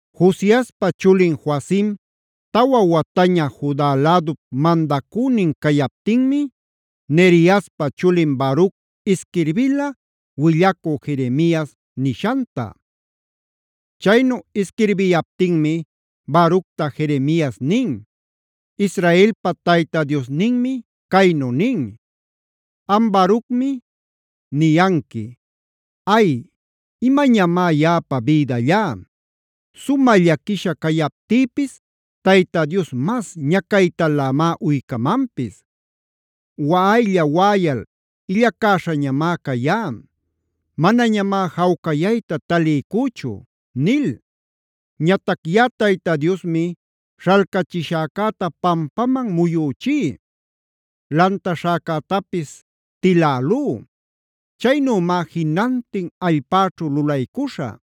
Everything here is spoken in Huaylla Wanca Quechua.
Josiaspa chulin Joacima tawa wataña Juda lädup mandacünin cayaptinmi, Neriaspa chulin Baruc isquirbila willacü Jeremias nishanta. Chaynu isquirbiyaptinmi Baructa Jeremias nin: “Israelpa Tayta Diosninmi caynu nin: Am Barucmi, niyanqui: ‘¡Ay, imañamá yaꞌapa bïdallá! Sumä llaquisha cayaptïpis Tayta Dios mas ñacaytalämá uycamanpis. Waꞌaylla-waꞌayal illacäśhañamá cayá; manañamá jawcayayta taliycüchu’ nil. Ñatac yaꞌa Tayta Diosmi śhalcachishäcäta pampaman muyüchí; lantaśhäcätapis tilälú. Chaynümá jinantin allpäćhu lulaycuśhä.